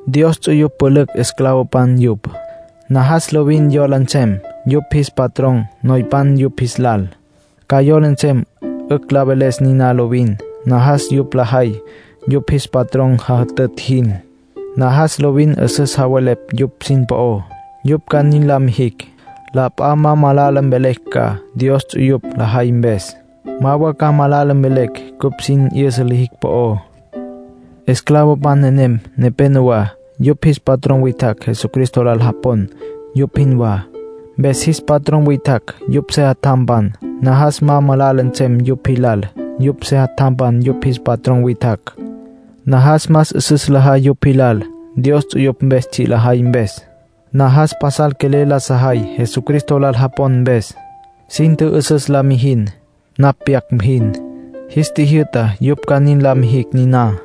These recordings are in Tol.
Dios ts'uyupj pülücj esclavopan yupj. Najas lovin yola nsem yupj jis patrón noypan yupj jis lal. Ca yola nsem 'ücj la veles niná lovin. Najas yupj lajay yupj jis patrón jajütütj jin. Najas lovin 'üsüs javelepj yupj sin po'ó. Yupj ca nin la mijicj, la p'a ma malala mvelecj ca Dios po'ó yupj lajay mpes, ma wa ca malala mvelecj cupj sin 'yüsa lijicj po'ó. Esclavopan nenem nepénowa, yupj jis patrón witjacj Jesucristo lal japon, yupj jinwá. Mpes jis patrón witjacj yupj sejatjampan. Najas ma malala nsem yupj jilal yupj sejatjampan yupj jis patrón witjacj. Najas más 'üsüs lajay yupj jilal, Dios ts'uyupj mpes tsji' lajay mpes; najas pasal quelel la sajay Jesucristo lal japon mpes. Sin tjü'üsüs la mijin napj pyac jin. Jis tjijyü'ta yupj ca nin la mijicj niná.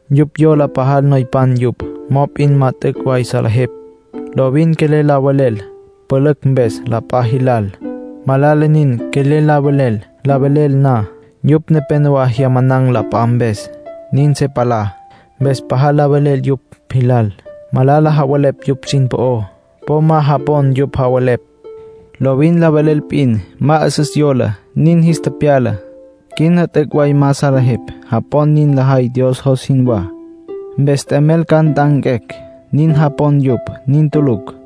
Yupj yola pajal noypan yupj. Mop'in ma t'üc' way salejepj. Lovin quelel la velel pülücj mpes la p'a jilal. Malala nin, quelel la velel. La velel na, yupj nepénowa jyaman̈ la p'a mpes, nin se palá. Mpes pajal la velel yupj jilal. Malala javelepj yupj sin po'ó. Po ma japon yupj javelepj. Lovin la velel p'in. Ma 'üsüs yola; nin jis tepyala. Quina t'üc' way ma salejepj. Japon nin lajay Dios jos jinwá, mpes t'emel ca nt'anquecj, nin japon yupj. Nin tulucj.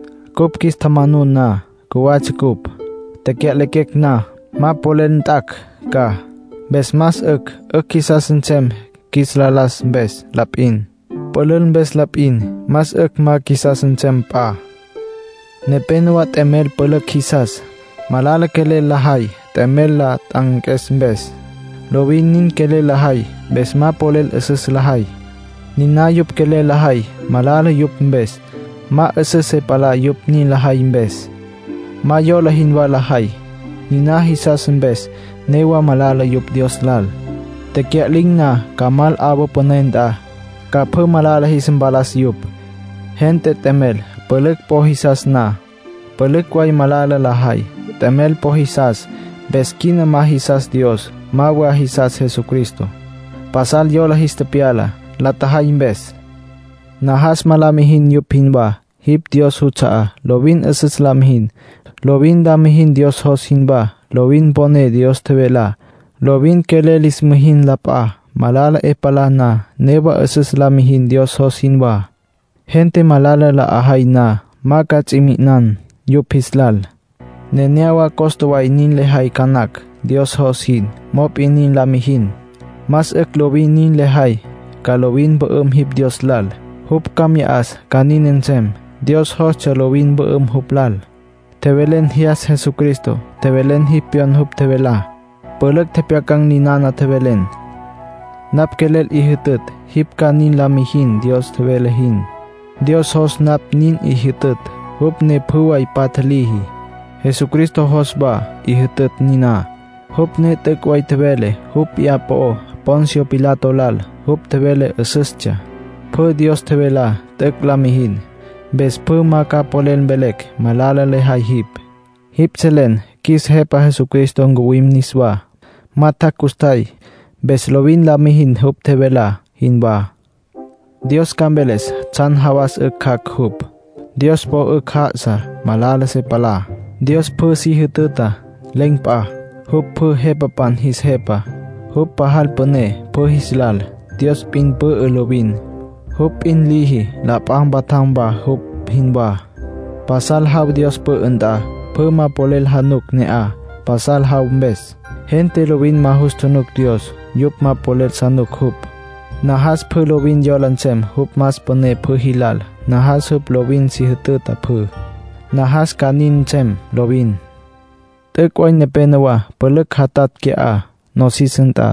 Cupj qjuis tjamanun na, cjuwatsja cupj. Tecya'lequecj na, ma polel nt'acj ca. Mpes más 'ücj 'ücj qjuisas nsem qjuis la las mpes la p'in, pülül mpes la p'in. Más 'ücj ma qjuisas nsem p'a. Nepénowa t'emel pülücj jisas. Malala quelel lajay t'emel la t'anques mpes. Lovin nin quelel lajay, mpes ma polel 'üsüs lajay. Niná yupj quelel lajay malala yupj mpes; ma 'üsüs se palá yupj nin lajay mpes. Ma yola jinwá lajay. Niná jisas mpes newa malala yupj Dios lal. Tecya'lin̈ na, ca mal 'awa püné nt'a, ca pjü malala jis mpalas yupj. Gente t'emel pülücj po jisas na, pülücj way malala lajay. T'emel po jisas, mpes quina ma jisas Dios, ma wa jisas Jesucristo. Pasal yola jis tepyala, la tjajay mpes. Najas ma la mijin yupj jinwá. Jipj Dios juts'a'á. Lovin 'üsüs la mijin. Lovin la mijin Dios jos jinwá. Lovin mponen Dios tjevelá. Lovin quelel lis mijin la p'a. Malala 'e palá na, newa 'üsüs la mijin Dios jos jinwá. Gente malala la 'ajay na, ma ca ts'i mi'inan yupj jis lal. Nenéyawa costa way nin lejay ca nacj Dios jos jin; mop'in nin la mijin. Más 'ücj lovin nin lejay. Ca lovin mpü'üm jipj Dios lal; jupj ca mya 'as ca nin nsem. Dios jostsja lovin mpü'üm jupj lal. Tjevelen jyas Jesucristo. Tjevelen jipj pyon jupj tjevelá. Pülücj tjepjyacan̈ ninana tjevelen. Napj quelel 'i jütütj jipj ca nin la mijin Dios tjevele jin. Dios jos napj nin 'i jütütj, jupj ne pjü way patja liji. Jesucristo jos wa 'i jütütj niná, jupj ne t'üc' way tjevele jupj p'iyá po'ó Poncio Pilato lal. Jupj tjevele 'üsüstsja. Pjü Dios tjevelá t'üc' la mijin. Mpes pjü ma ca polel mvelecj malala lejay jipj. Jipj selen qjuis Jepa Jesucristo ncuwim niswá. Ma tjac' custjay. Mpes lovin la mijin jupj tjevelá jinwá. Dios ca mveles tsjan jawas 'ücj jac' jupj. Dios po 'ücj já'asa, ma malala se palá. Dios pjü si jütüta. Len̈ p'a. Jupj pjü jepapan jis Jepa. Jupj pajal püné pjü jis lal. Dios p'in pü'ü lovin, jupj p'in liji la p'a mpatjam wa jupj jinwá. Pasal jaw Dios pü'ü nt'a. Pjü ma polel januc ne'aj, pasal jaw mpes. Gente lovin ma jus tjunuc Dios. Yupj ma polel januc jupj. Najas pjü lovin yola nsem jupj más püné pjü jilal. Najas jupj lovin si jütüta pjü. Najas ca nin nsem lovin. T'üc' way nepénowa pülücj jatatj qui'á, nosis nt'a.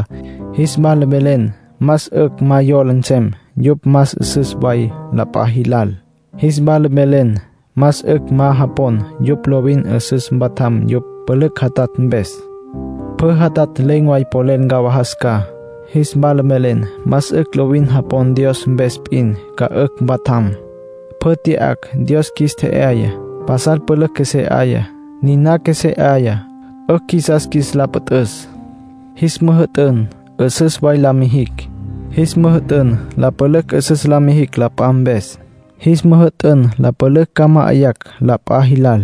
Jis wala mvelen más 'ücj ma yola nsem yupj más 'üsüs way la p'a jilal. Jis wala mvelen más 'ücj ma japon yupj lovin 'üsüs mpatjam yupj pülücj jatatj mpes. Pjü jatatj len̈ way polel ncawajas ca. Jis wala mvelen más 'ücj lovin japon Dios mpes p'in ca 'ücj mpatjam. Pjü tya'acj, Dios qjuis tje'yaya. Pasal pülücj qjuesé 'aya. Niná qjuesé 'aya, 'ücj qjuisas qjuis la püt'üs. Jis müjü'tün 'üsüs way la mijicj. Jis müjü'tün la pülücj 'üsüs la mijicj la p'a mpes. Jis müjü'tün la pülücj ca ma'ayacj la p'a jilal.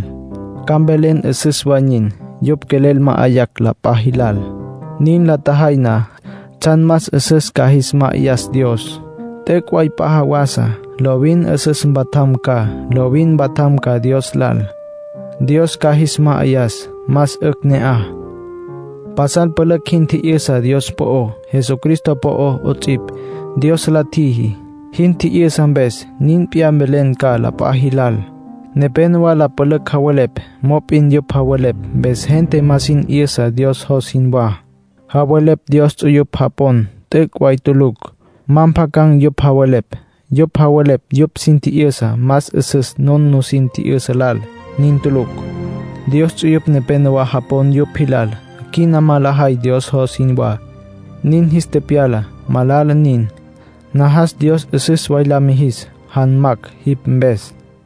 Ca mvelen 'üsüs way nin, yupj quelel ma'ayacj la p'a jilal. Nin la tjajay na, tsjan más 'üsüs ca jis ma'ayas Dios. T'üc' way p'a jawasa lovin 'üsüs mpatjam ca. Lovin mpatjam ca Dios lal, Dios ca jis ma'ayas. Más 'ücj ne'aj. Pasal pülücj jin tji'yüsa Dios po'ó, Jesucristo po'ó 'ots'ipj, Dios la tjiji. Jin tji'yüsa mpes, nin p'iyá mvelen ca la p'a jilal. Nepénowa la pülücj javelepj, mop'in yupj javelepj mpes gente ma sin 'yüsa Dios jos jinwá. Javelepj Dios ts'uyupj japon t'üc' way tulucj. Ma mpjacan̈ yupj javelepj. Yupj javelepj yupj sin tji'yüsá más 'üsüs nun nusin tji'yüsa lal. Nin tulucj. Dios ts'uyupj nepénowa japon yupj jilal. Quina ma lajay Dios jos jinwá, nin jis tepyala. Malala nin. Najas Dios 'üsüs way la mijis janmacj jipj mpes.